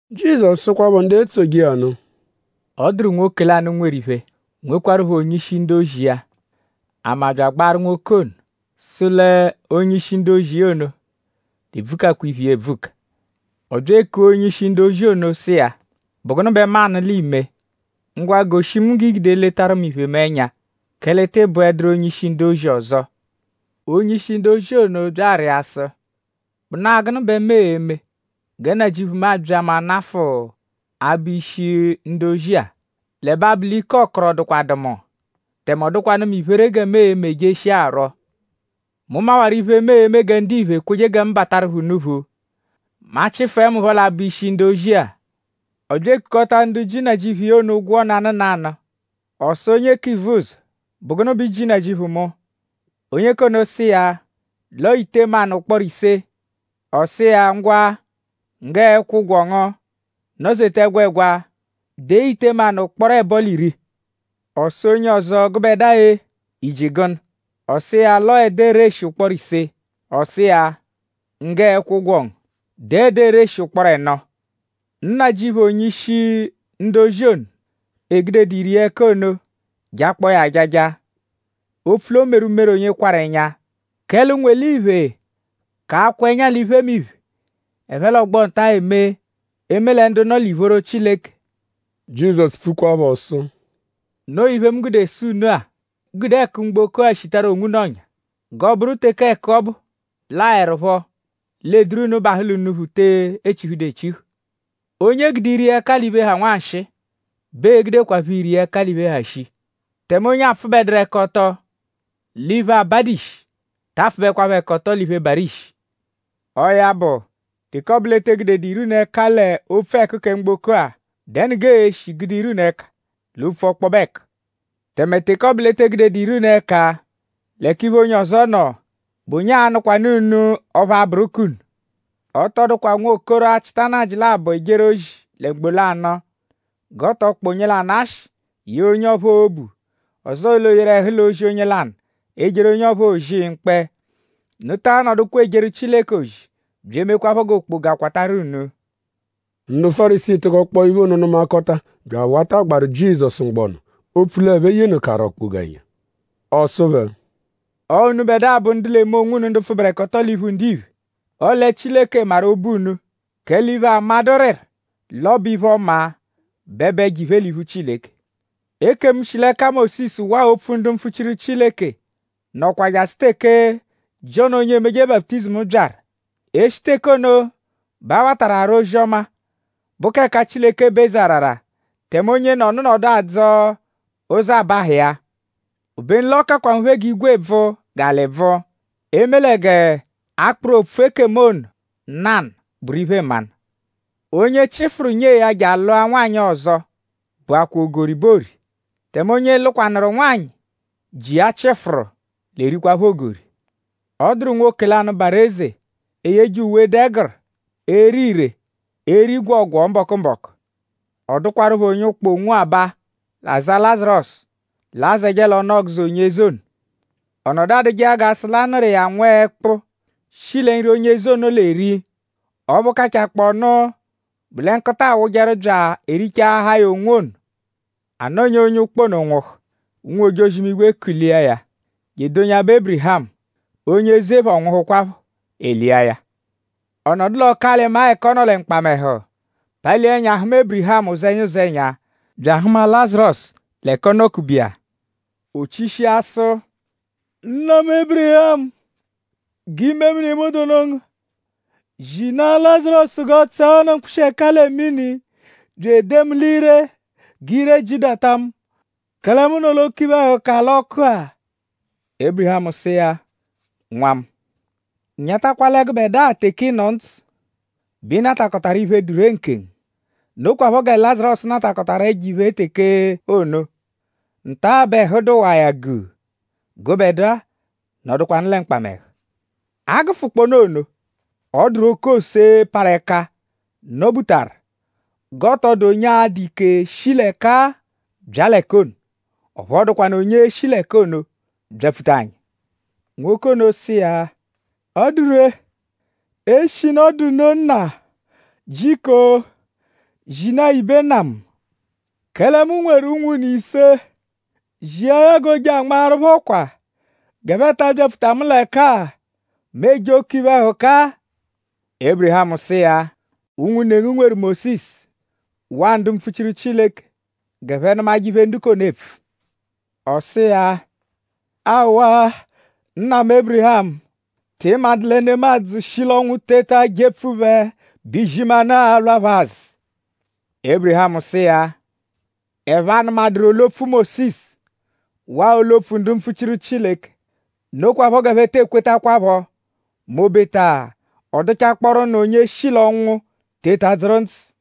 Jizọsu sụkwapho ndu etsoje iya nụ: “Ọ dụru nwoke lanụ, nweru iphe; nwekwarụpho onye-ishi ndu-ozi iya. Ama bya agbaarụ nwoke ono sụ l'onye-ishi ndu-ozi iya ono l'ebvukakwa iphe iya ebvuka. Ọ bya ekua onye-ishi ndu-ozi ono sụ iya: ‘?Bụ gụnu bẹ mu anụ l'iime? Ngwa; goshi mu g'i gude eletaru mu iphe mu ẹnya; kẹle ị tịi bụeduru mu onye-ishi ndu-ozi ọzo.’ Onye-ishi ndu-ozi ono bya arịa sụ: ‘?Bụnaa gụnu bẹ mu e-me gẹ nnajịuphu mu abya mu anafụ abụ ishi ndu-ozi-a? L'ẹbe abụ l'ike ọkoro dụkwadu mu; tẹme ọ dụkwanu mu iphere gẹ mu e-me jeshia arwọ. Mu mawaru iphe, mu e-me gẹ ndiphe ekweje gẹ mu bataru phẹ unuphu mẹ a -chịfue mu phọ l'abụ ishi ndu-ozi-a.’ Ọ bya ekukọta ndu ji nnajịuphu iya ono ụgwo nanụ nanụ. Ọ sụ onye k'ivuzọ: ‘?Bụ gụnu bẹ i ji nnajịuphu mu?’ Onye k'ono sụ iya l'ọo ite manụ ụkporo ise. Ọ sụ iya: ‘Ngwa; nggẹ ẹkwo-ụgwo ngu; nọ-zeta ẹgwegwa; dee ite manụ ụkporo ẹbo l'iri.’ Ọ sụ onye ọzo: ‘Gụbedua-e?i ji gụnu?’ Ọ sụ iya l'ọo ẹda ereshi ụkporo ise. Ọ sụ iya: ‘Nggẹ ẹkwo-ụgwo ngu; dee ẹda ereshi ụkporo ẹno.’ Nnajịuphu onye-ishi ndu-ozi ono, 'eegudedu ire iya ẹka ono jakpọo ya ajaja; opfu l'o meru umere onye kwarụ ẹnya; kẹle ụnwu-eliphe ka akwa ẹnya l'iphemiphe, ẹphe l'ọgbo-nta-a eme; eme lẹ ndu nọ l'ìphóró Chileke.” Jizọsu pfukwaphọ sụ: “Noo iphe, mu gude sụ unu-a: g'unu gude ẹku mgboko-a shitaru onwunu ọ̀nyà; g'ọo-bụru teke ẹku ọbu laẹrupho l'ee-duru unu bahụ l'unuphu, te echihudu echihu. Onye e gude ire iya ẹka l'iphe, ha nwanshịi bẹ ee-gudekwaphọ ire iya ẹka l'iphe, ha shii; tẹme onye 'apfụbeduru-ẹka-ọto l'iphe, abadu ishi ta apfụbekwapho-ẹka-ọto l'iphe, barụ ishi. Ọo ya bụ; teke ọ bụ l'e te gudedu ire unu ẹka l'opfu ẹku kẹ mgboko-a;?dẹnu g'ee-shi gude ire unu ẹka l'opfu ọkpobe ẹku? Tẹme; teke ọ bụ l'e te gudedu ire unu ẹka l'ẹka iphe onye ọzo nọ;?bụ onye a-nụkwanu unu ọphu a-bụru k'unu? “Ọ tọ dụkwa nwokoro, achịta nnajị labọ ejeru ozi lẹ mgbo lanụ g'ọ tọ kpọ nanụ ashị; yee onye ọphuu obu; ọzoo l'o yeru ẹhu l'ozi onye lanụ; ejeru onye ọphuu ozi mkpẹ. Unu taa nọdukwa ejeru Chileke ozi bya emekwaphọ g'okpoga kwatarụ unu.” Ndu Fárisii tụkokpoo iphe ono nụmakota bya awata agbaru Jizọsu mgbọnu; opfu l'ẹphe yenụkaru okpoga ẹnya. Ọ sụ phẹ: “Ọo unubẹdua bụ ndu l'eme onwunu ndu pfụberekoto l'iphu ndiphe; ọle Chileke maru obu unu; kẹle iphe, amadụ rịru l'ọ bụ iphe-ọma bẹ bụ ẹjo-iphe l'iphu Chileke. “Ekemu, shi l'ẹka Mósisu; waa opfu ndu mpfuchiru Chileke nọkwa jasụ teke Jiọnu onye emeje baputizimu byaru. E -shi teke ono bẹ a watarụ ara ozi-ọma, bụ k'ẹka Chileke bụ eze arara; tẹme onyenọnu nọdu adzọ ụzo abahụ iya. Obenu l'ọ kakwa nphe g'igwe bvụ; g'alị bvụ; eme lẹ g'akpụru opfu ekemu ono nanụ bụru iphe-mmanụ. “Onye chịfuru nyee ya je alụa nwanyị ọzo bụakwaa ogori bẹ oori; tẹme onye lụkwanuru nwanyị, ji iya chịfuru l'erikwaphọ ogori.” “Ọ dụru nwoke lanụ, barụ eze, eyeje uwe, dụ ẹguru bya ere ire; eri gwọogwoo mbọku-mbọku. Ọ dụkwarupho onye ụkpa, onwo aba, aza Lazarọsu, l'azẹje l'ọnu-ọguzo onye eze ono. Ọ nọdu adụje iya g'a sụ l'a nụru iya nwẹekpu, shi lẹ nri, eze ono l'eri. Ọphu kachaakpọnu bụ lẹ nkụta awụjeru bya erichaahaa ya onwo ono. A nọnya; onye ụkpa ono nwụhu; ụnwu-ojozi-imigwe kulia ya je edonyabẹ Ébirihamu. Onye eze phọ nwụhukwapho; e lia ya. Ọ nọdu l'ọku-alị-maa ẹka ọ nọ lẹ mkpamẹhu; palia ẹnya; hụma Ébirihamu ụzenya-ụzenya bya ahụma Lazarọsu l'ẹka ọ nọ-kube iya. “O chishia sụ: ‘Nna mu Ébirihamu; g'imemini mu dụnu ngu! Zinaa Lazarọsu g'ọ tsẹe ọnu mkpụshi-ẹka lẹ mini bya edee mu l'ire g'ire jidata mu; kẹle mu nọ l'oke iphe-ẹhuka l'ọku-a.’ Ébirihamu sụ iya: ‘Nwa mu; nyatakwa lẹ gụbedua teke ị nọ ndzụ bẹ ị natakọtaru iphe, dụ ree nkengu; nokwaphọ gẹ Lazarọsu natakọtaru ẹjo-iphe teke ono. Nta-a bẹ ẹhu dụwaa iya guu; gụbedua nọdukwanu lẹ mkpamẹhu. A -gụfukpoonu ono; ọ dụru oke ose, parụ ẹka nọ-butaru g'ọ tọ dụ onye a-dụ ike shi l'ẹka-a bya l'ẹka ono; ọphu ọ dụkwanu onye l'e-shi l'ẹka ono byapfuta anyi.’ Nwoke ono sụ iya: ‘Ọ dụ ree; eshinu ọ dụ nno nna; jiko zinaa ya ibe nna mu; kẹle mu nweru unwune ise; zia ya g'o je anmaaru phẹ ọkwa g'ẹphe ta abyapfuta mu l'ẹka-a, mu eje oke iphe-ẹhuka-a.’ Ébirihamu sụ iya: ‘Unwune ngu nweru Mósisu waa ndu mpfuchiru Chileke; g'ẹphe nụmaje iphe, ndu k'ono epfu.’ Ọ sụ iya: ‘Aawa nna mu Ébirihamu!?Tị madụ lẹ nemadzụ -shi l'ọnwu teta jepfu phẹ bẹ izimanụ a-lwa phẹ-a azụ.’ ‘Ébirihamu sụ iya: Ẹphe -anụmaduru olu-opfu Mósisu waa olu-opfu ndu mpfuchiru Chileke; nokwaphọ g'ẹphe tee kwetakwaphọ m'obeta ọ dụchakpooru nụ onye shi l'ọnwu teta dzụru ndzụ.’”